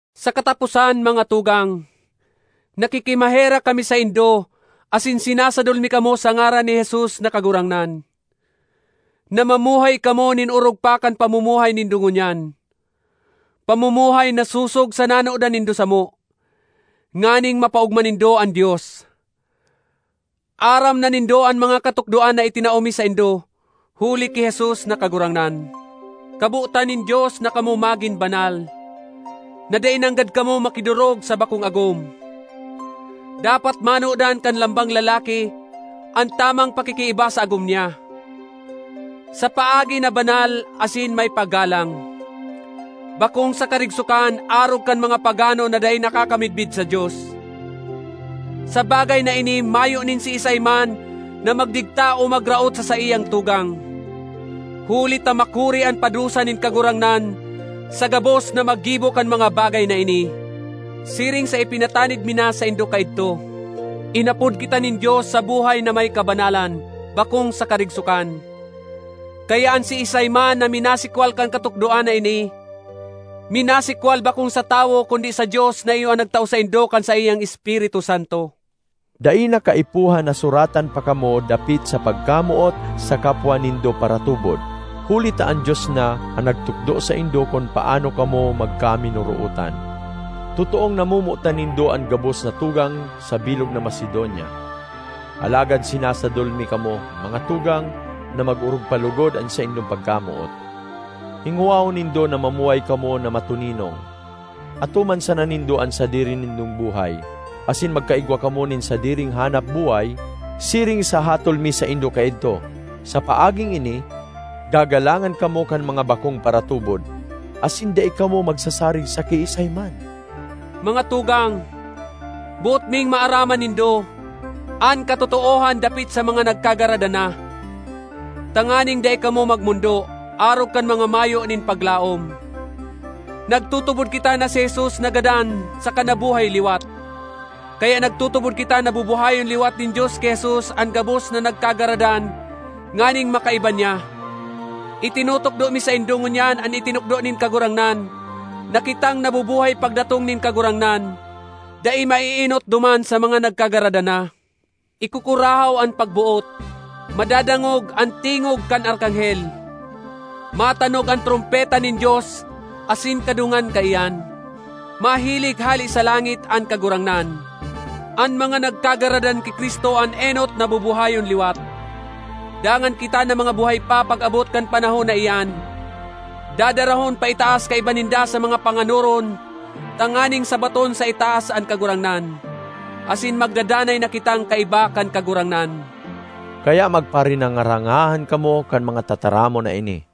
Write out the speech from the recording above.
Sa kataposan, mga tugang, nakikimaherak kami saindo asin sinasadol mi kamo sa ngaran ni Jesus na Kagurangnan, na mamuhay kamo nin orog pa kan pamumuhay nindo ngunyan—pamumuhay na sosog sa nanodan nindo samo—nganing mapaogma nindo an Dios. Aram na nindo an mga katukdoan na itinao mi saindo huli ki Jesus na Kagurangnan. Kabotan nin Dios na kamo magin banal; na dai nanggad kamo makidorog sa bakong agom. Dapat manodan kan lambang lalaki an tamang pakikiiba sa agom niya, sa paagi na banal asin may paggalang, bakong sa karigsokan arog kan mga pagano na dai nakakamidbid sa Dios. Sa bagay na ini mayo nin siisay man na magdigta o magraot sa saiyang tugang, huli ta makuri an padusa nin Kagurangnan sa gabos na maggibo kan mga bagay na ini, siring sa ipinatanid mi na saindo kaidto. Inapod kita nin Dios sa buhay na may kabanalan, bakong sa karigsokan. Kaya an siisay man na minasikwal kan katukdoan na ini, minasikwal bakong sa tawo kundi sa Dios na iyo an nagtao saindo kan saiyang Espiritu Santo. Dai na kaipuhan na suratan pa kamo dapit sa pagkamoot sa kapwa nindo paratubod, huli ta an Dios na an nagtukdo saindo kun paano kamo magkaminorootan. Totoong namomotan nindo an gabos na tugang sa bilog na Macedonia. Alagad sinasadol mi kamo, mga tugang, na mag-orog pa logod an saindong pagkamoot. Hingowahon nindo na mamuhay kamo na matoninong; atoman sana nindo an sadiri nindong buhay, asin magkaigwa kamo nin sadiring hanap-buhay, siring sa hatol mi saindo kaidto. Sa paaging ini, gagalangan kamo kan mga bakong paratubod, asin dai kamo magsasarig sa kiisay man. Mga tugang, boot ming maaraman nindo an katotoohan dapit sa mga nagkagaradan na, tanganing dai kamo magmondo, arog kan mga mayo nin paglaom. Nagtutubod kita na si Jesus nagadan saka nabuhay liwat. Kaya nagtutubod kita na bubuhayon liwat nin Dios ki Jesus an gabos na nagkagaradan nganing makaiba niya. Itinutukdo mi saindo ngunyan an itinukdo nin Kagurangnan na kitang nabubuhay pagdatong nin Kagurangnan, dai maeenot duman sa mga nagkagaradan na. Ikukurahaw an pagboot, madadangog an tingog kan arkanghel, matanog an trompeta nin Dios asin kadungan kaiyan, mahilig hale sa langit an Kagurangnan. An mga nagkagaradan ki Cristo an enot na bubuhayon liwat. Dangan kita na mga buhay pa pag-abot kan panahon na iyan, dadarahon paitaas kaiba ninda sa mga panganoron tanganing sabaton sa itaas an Kagurangnan. Asin magdadanay na kitang kaiba kan Kagurangnan. Kaya magparinanga-rangahan kamo kan mga tataramon na ini.